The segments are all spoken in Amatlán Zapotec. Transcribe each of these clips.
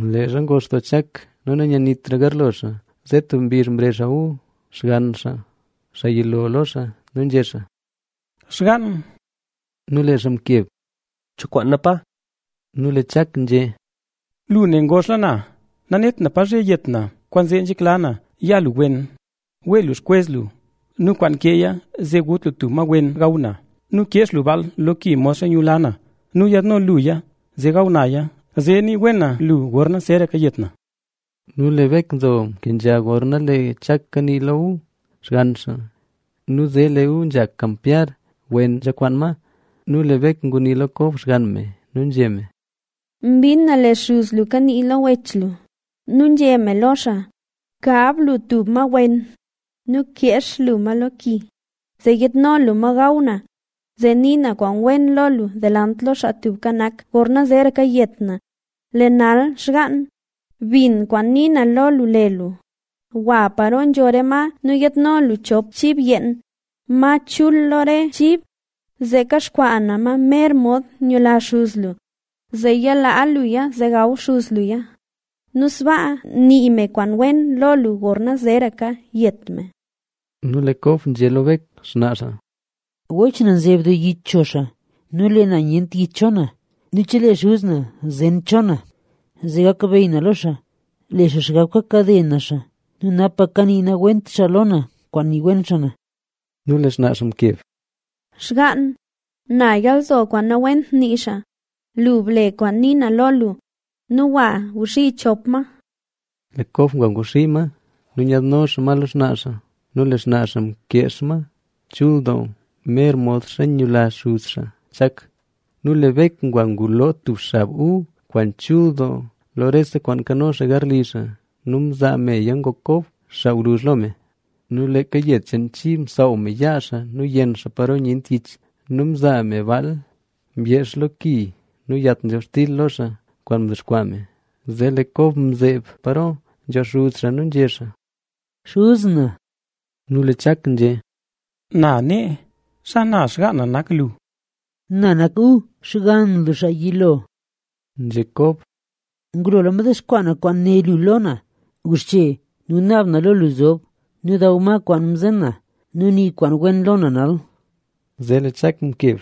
Leezha ngox doo Chak nu nanyanitra garlo xaa, zee tub mbizh mrezh xaa Esaú, xgann xaa xaa yilo lo xaa. Nu nzhé xaa: —Xgaan. Nu lee xaa mkeb: —¿Cho kwaana, Pa? Nu lee Chak nzhé: —Lu ne ngoxla na. Nanet na pa zhe yet na. Kwaanzee nzhekla na ya lu wen. Wee lu xkwez lu nu kwaan nkeeya, zee gut lu tub ma wen gaw na. Nu keex lu baal lo ki modxa nyula na nu yaadno luya zee gaw naya, zee nii wen na lo lu gorna zeeraka yet na. Nu lee Bek nzo mkenzha gorna lee Chak kanii lo Esaú, xgann xaa. Nu zee lee Esaú nzha kampyar wen nzha kwaan ma. Nu lee Bek ngunii lo Kob xgann me nu nzhé me: —Mbin na lee xuz lu kanii lo wech lu nu nzhé me lo xaa: “Kab lu tub ma wen nu keex lu ma lo ki, zee yiidno lu ma gaw na, zee nii na kwaan wen lo lu delant lo Xaa Tubka Nak gorna zeeraka yet na”. Lee nal xgaan, bin kwaan nii na lo lu le lu. Gwa paro nzho re ma nu yaadno lu chop chib yeen, ma chul lo re chib, zee kaxkwaa na ma mer mod nyula xuz lu. Zee ya laa luya zee gaw xuz luya nu sbaa nii me kwaan wen lo lu gorna zeeraka yet me. Nu lee Kob nzhé lo Bek, xnaa xaa: —Wech na nzeb doo yich cho xaa nu lee na nyent yich cho na. Nu chelee xuz na zen cho na, zee gakbeyy na lo xaa, le xaa xgab kakade na xaa nu napa kanii nawent xaa na lo kwaan nii wen xaa na. Nu lee xnaa xaa mkeb: —Xgaan, na yalzo kwaan nawent nii xaa. Lu ble kwaan ni na lo lu nu gwa guxii chop ma. Zee lee Kob ngwaxii chop ma nu nyaadno xaa ma lo xnaa xaa. Nu lee xnaa xaa mkeex ma chul doo mer modxa nyula xuz xaa Chak. Nu lee Bek ngwa nguloo tub xab Esaú kwaan chul doo lo rese kwaan nkano xaa garli xaa; nu mzaa meya ngok Kob, xaa gwluzh lo me. Nu leeka yed cheen chib msaaw me yaa xaa nu yenn xaa paro nyent yich. Nu mzaa me baal myeex lo ki nu yat nzhobxtil lo xaa kwaan mdexkwaa me. Zee lee Kob mzeeb paro nzho xuz xaa nu nzhé xaa: —Xuz na. Nu lee Chak nzhé: —Na nee. ¿Xana xgaan na nak lu? —Na nak Esaú, xgann lu xaa yilo —nzhé Kob—. Ngulola mdexkwaa na kwaan né lu lo na. Guxche nu naab na lo lu zob nu daw ma kwaan mzen na; nu nii kwaan wen lo na nal. Zee lee Chak mkeb: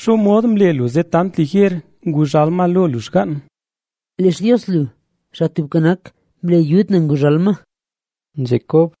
—¿Xomod mle lu zee tant liger nguzhal ma lo lu, xgaan? —Lee Xtios lu, Xaa Tubka Nak, mle yud na nguzhal ma —nzhé Kob.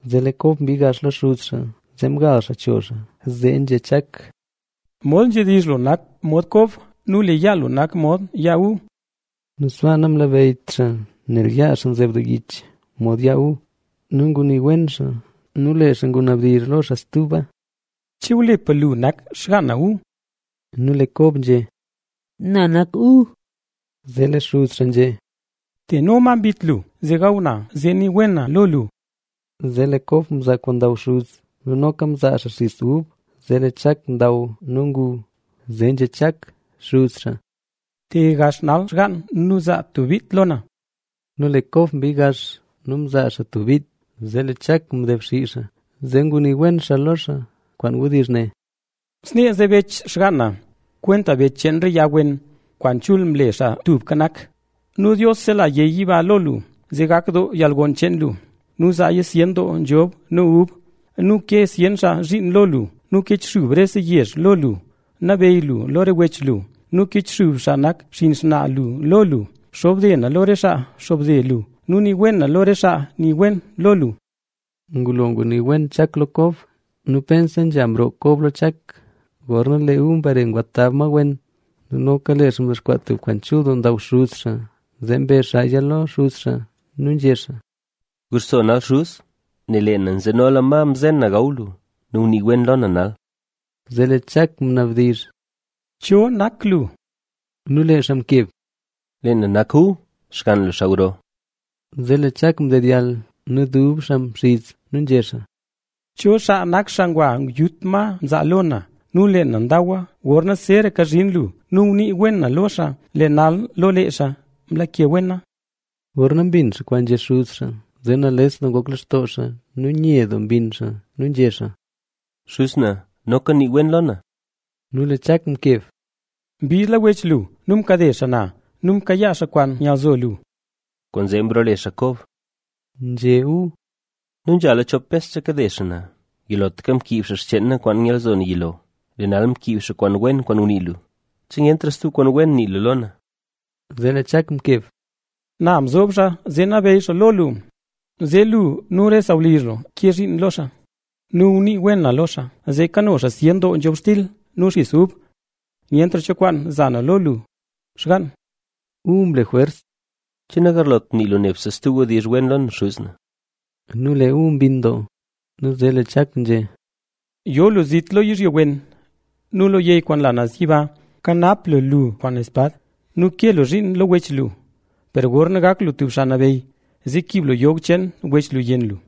Nu lee Kob mbii gax lo xuz xaa, zee mgal xaa cho xaa, zee nzhé Chak: —Mod nzhedizh lu nak mod Kob nu lee yaa lu nak mod yaa Esaú. Nu sbaa namlabeyyt xaa nel yaa xaa nzeb doo yich mod yaa Esaú. Nu ngunii wen xaa. Nu lee xaa ngunabdizh lo xaa stuba: —¿Che wlipa lu nak xgaan na Esaú? Nu lee Kob nzhé: —Na nak Esaú. Zee lee xuz xaa nzhé: —Teno ma mbit lu, zee gaw na, zee nii wen na lo lu. Zee lee Kob mzaa kwaan ndaw xuz xaa nu noka mzaa xaa xis ub ngu xaa. Zee lee Chak ndaw nu ngu. Zee nzhé Chak: —Te gax nal xgaan nu zaa tub bit lo na. Nu lee Kob mbii gax nu mzaa xaa tub bit. Zee lee Chak mdebxii xaa, zee ngunii wen xaa lo xaa kwaan wdizh ne: ¡Snee nzebech xgaan na, kwenta bech cheen re yag wen, kwaan chul mle Xaa Tubka Nak! Nu Dios sela yey yiba lo lu zee gak doo yalgon cheen lu nu zaaya zyen doo nzhobxtil nu ub. Nu ke zyen xaa zhiin lo lu nu kichxub rese yezh lo lu. Nabeyy lu lo re wech lu nu kichxub xaa nak xinn xnaa lu lo lu. Xobde na lo re xaa xobde lo lu nu nii wen na lo re xaa nii wen lo lu. Ngulo ngunii wen Chak lo Kob nu pense nzha mroo Kob lo Chak, gorna lee Esaú mbare ngwa tab ma wen. Nu noka lee xaa mdexkwaa tub kwaan chul doo ndaaw. Zee mbe xaaya lo xuz xaa nu nzhé xaa: —Guxso nal xuz, nel lee na nzenola ma mzen na gaw lu. Nu gunii wen lo na nal. Zee lee Chak ngunabdizh: —¿Cho nak lu? Nu lee xaa mkeb: —Lee na nak Esaú, xgann lu, xaa gro. Zee lee Chak mdedyall nu dub xaa mxiz nu nzhé xaa: —¿Cho xaa nak xaa ngwa yut ma mzaa lo na? Nu lee na ndawa gorna zeeraka zhin lu. Nu ngunii wen na lo xaa, lee nal lo lee xaa mlake wena. Gorna mbin xaa kwaan nzhé xuz xaa, zee nales doo ngok lextoo xaa nu nye doo mbinn xaa nu nzhé xaa: —¡Xuz na, noka nii wen lo na! Nu lee Chak mkeb: —Mbiidla wech lu nu mkade xaa na nu mkayaa xaa kwaan nyalzo lu. —¡Kwaanzee mroole xaa Kob!a —nzhé Esaú—. Nu nzhala chop bes nzha kakade xaa na; yilotlaka mkiib xaa xcheen na kwaan nyalzo xaa yilo, lee nal mkiib xaa kwaan wen kwaan ngunii lu. ¿Che nyentra stub kwaan wen nii lu lo na? Zee lee Chak mkeb: —Na mzob xaa zee nabeyy xaa lo lu, zee lu nu re sawlizh lu ke zhiin lo xaa. Nu ngunii wen na lo xaa zee kano xaa zyen doo nzhobxtil nu xis ub. Nyentra cho kwaan za na lo lu, xgann. Esaú mle jwers: —¿Che nagarlot nii lu nebse stub wdizh wen lo na, xuz na? Nu lee Esaú mbinn doo. Nu zee lee Chak nzhé: Yo lu zit lo yizhyo wen nu lo yey kwaan nla naz yiba. Kwaan xspad lu ban lu nu ke lu zhiin lo wech lu. Per gorna gak lu tub xaa nabeyy, zee kiib lu yog cheen wech lu yenn lu.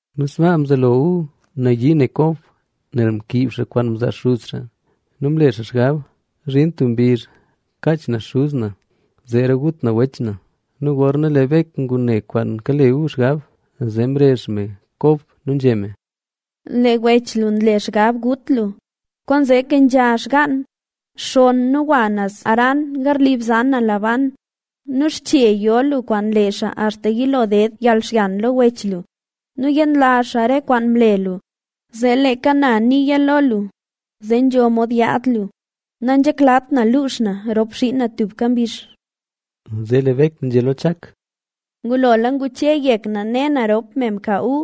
Nu sbaa mzelo Esaú nayii ne Kob, nel mkiib xaa kwaan mzaa xuz xaa nu mle xaa xgab: “Zhin tub mbizh kaach na xuz na, ¡zeera gut na wech na!” Nu gorna lee Bek ngune kwaan kale Esaú xgab, zee mrezh me Kob nu nzhé me: —Lee wech lu nle xgab gut lu. Kwaanzee kenzha xgann, xonn nu gwa naz Harán garli bzan na Labán. Nu xche yo lu kwaan lee xaa axta yilo ded yalxyan lo wech lu nu yenlazh xaa re kwaan mle lu. Zee leeka na niya lo lu, zee nzho mod yaad lu. Nanzheklat na luux na rop xiin na tuka mbizh. Zee lee Bek nzhé lo Chak: —Ngulola nguche yek na ne na rop me mka Esaú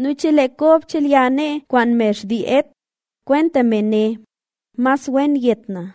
nu chelee Kob chelya nee kwaan me xtii Het, kwenta me ne, ¡mas wen yet na!